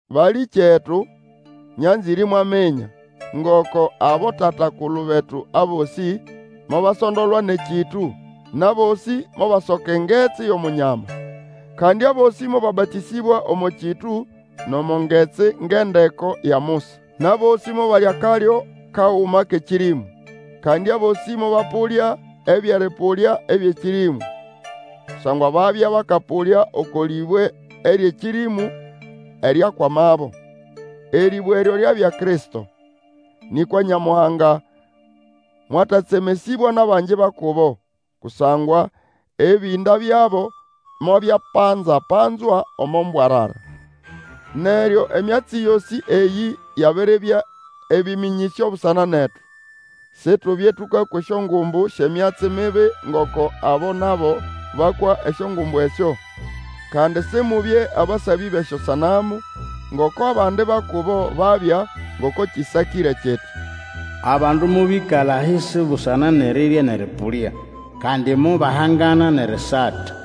Balĩkyetu, nyanzĩre imwaminya, ngoko abotata-kulu betu abosĩ mobasondolwa nʼekĩtũ, nʼabosĩ mobasoka Engetsi yʼOmunyama. Kandi abosĩ mobabatĩsĩbwa omo kĩtũ nʼomo ngetsi ngʼendeko ya Musa. Nʼabosĩ mobalya akalyo kaguma kʼekĩrĩmũ. Kandi abosĩ mobapũlya ebyʼerĩpũlya ebyʼekĩrĩmũ, kusangwa babya bakapũlya oko lĩbwe eryʼekĩrĩmũ, eryakwamabo. Erĩbwe eryo lyabya Kristo. Nĩkwa Nyamuhanga mwatatsemesĩbwa nʼabangi ba kubo; kusangwa ebĩnda byabo mobyapanzapanzwa omo mbwarara. Neryo, emyatsi yosĩ eyĩ yabiribya ebĩmĩnyĩsyo busana netu, situbye tũkakwa esyongumbu syʼemyatsi mibi ngoko abo nabo bakwa esyongumbu esyo. Kandi Simubye abasabĩ bʼesyosanamu, ngoko abandi ba kubo babya, ngoko kĩsakĩre kiti. Abandu mobĩkala ahisi busana nʼerirya nʼerĩpũlya, kandi mobahangana nʼerisata.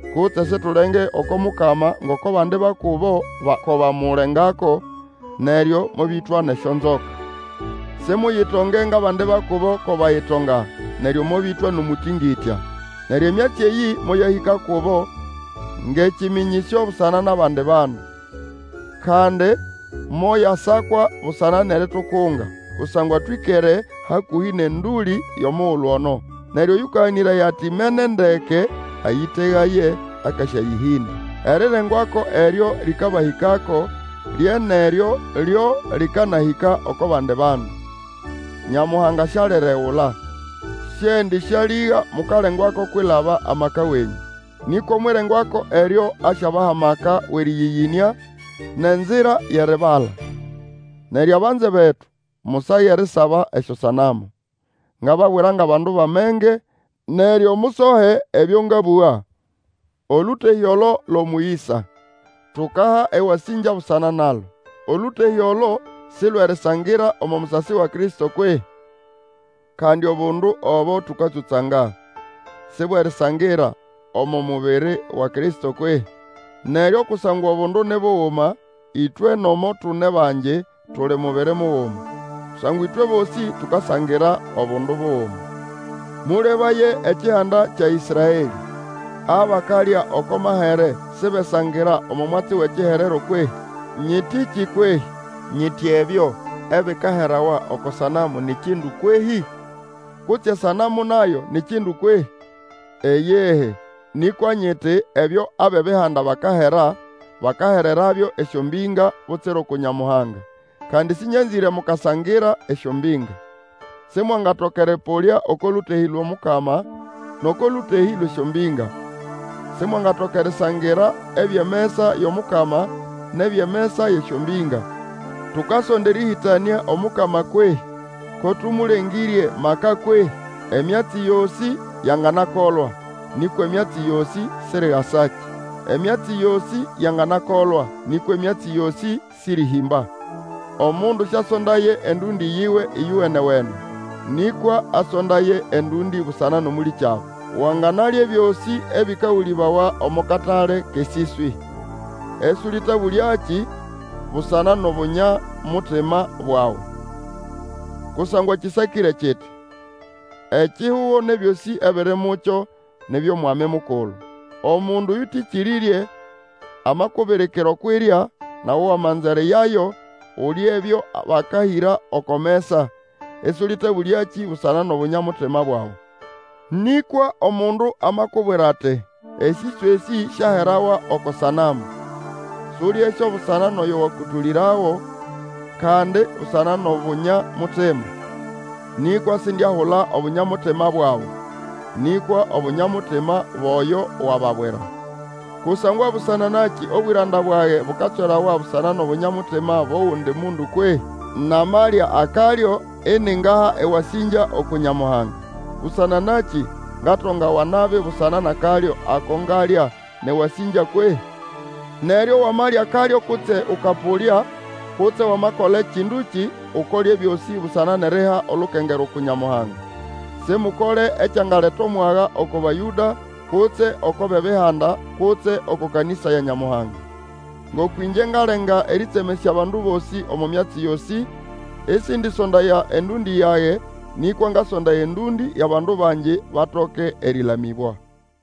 Kutse situlenge oko Mukama ngoko abandi ba kubo ko bamulengako, neryo mobĩtwa nʼesyonzoka. Simuyitonge ngʼabandi ba kubo ko bayitonga, neryo mobĩtwa omũtĩngĩtya. Neryo emyatsi eyĩ moyahĩka kubo ngʼekĩmĩnyĩsyo busana nʼabandi bandu, kandi moyasakwa busana nʼeritukunga. Kusangwa twĩkere hakũhĩ nʼendũlĩ yʼomugulu ono. Neryo oyũkaganĩraya ati imene ndeke, ayĩtegaye akasyayĩhĩnda. Erirengwako eryo lĩkabahĩkako lye nʼeryo lyo lĩkanahĩka oko bandi bandu; Nyamuhanga sialiregula, siendĩsyalĩga mukalengwako kwilaba amaka wenyũ; nĩkwa omwʼirengwako eryo asyabaha amaka wʼerĩyĩyĩnĩa, nʼenzira yʼeribala. Neryo abanze betu, musage erisaba esyosanamu. Ngababwira ngʼabandu bʼamenge; neryo musohe ebyo ngabũga. Olũtehĩ olo lwʼomũyĩsa, tukaha ewasĩngya busana nalo. Olũtehĩ olo si lwʼerisangira omo musasi wa Kristo kwehĩ? Kandi obundu obo tũkatsũtsanga, si bwʼerisangira omo mubiri wa Kristo kwehĩ? Neryo kusangwa obundu ni buguma, ĩtwe nomo tune bangi, tuli mubiri muguma. Kusangwa ĩtwe bosĩ tukasangira obundu buguma. Mũlebaye ekihanda kya Ĩsraelĩ; abakalya oko mahere sibesangira omo mwatsi wʼekiherero kwehĩ? Nyĩtĩkĩ kwehĩ? Nyiti ebyo ebikaherawa oko sanamu ni kindu kwehĩ? Kutse esanamu nayo ni kindu kwehĩ? Iyihi; nĩkwa nyiti, ebyo abʼEbihanda bakahera, bakahererabyo esyombĩnga, butsira uku Nyamuhanga; kandi sĩnyanzĩre mukasangira esyombĩnga. Simwangatoka erĩpũlya oko lũtehĩ lwʼOmukama nʼoko lũtehĩ lwʼesyombĩnga; Simwangatoka erisangira ebyʼemesa yʼomukama nʼebyʼemesa yʼesyombĩnga. Tukasonda erĩhĩtanĩa Omukama kwehĩ? Ko tũmũlengĩrye maka kwehĩ? Emyatsi yosĩ yanganakolwa, nĩkwa emyatsi yosĩ sirigasakĩ. Emyatsi yosĩ yanganakolwa, nĩkwa emyatsi yosĩ sĩrĩhĩmba. Omundu sĩasondaye endũndĩ yiwe ĩyowene-wene, nĩkwa asondaye endũndĩ busana nʼomũlĩkyabo. Wanganalya ebyosĩ ebĩkagũlĩbawa omo katale kʼesĩswĩ, ĩsũlĩtabũlyakĩ busana nʼobunya-mutima bwawe. Kusangwa kĩsakĩre kiti, Ekihugo nʼebyosĩ ebiri mukyo ni byʼOmwami Mukulu. Omundu oyũtĩkĩrĩrye amakubirikira okwʼirya, nawe wamanza eriyayo, ulye ebyo bakahĩra oko mesa, ĩsũlĩtabũlyakĩ busana nʼobunya-mutima bwawe. Nĩkwa omundu amakubwira ati, Esĩswĩ esĩ syaherawa oko sanamu, sulyesyo busana nʼoyo wakũtũlĩrago, kandi busana nʼobunya-mutima. Nĩkwa sindiahula Obunya-mutima bwawe, nĩkwa obunya-mutima bwʼoyo wababwira. Kusangwa busana nakĩ obwĩranda bwage bukatswerawa busana nʼobunya-mutima bwʼogundi mundu kwehĩ? Namalya akalyo iningaha ewasĩngya uku Nyamuhanga, busana nakĩ ngatongawa nabi busana nʼakalyo ako ngalya nʼewasĩngya kwehĩ? Neryo wamalya akalyo kutse ũkapũlya, kutse Wamakola ekĩndũkĩ, Ukole ebyosĩ busana nʼeriha olukengerwa uku Nyamuhanga. Simukole ekyangaleta omwaga oko Bayũda, kutse oko bʼEbihanda, kutse oko kanĩsa ya Nyamuhanga. Ngoko ĩngye ngalenga erĩtsemesya abandu bosĩ omo myatsi yosĩ, ĩsĩndĩsondaya endũndĩ yage, nĩkwa ngasondaya endũndĩ yʼabandu bangi, batoke erĩlamĩbwa.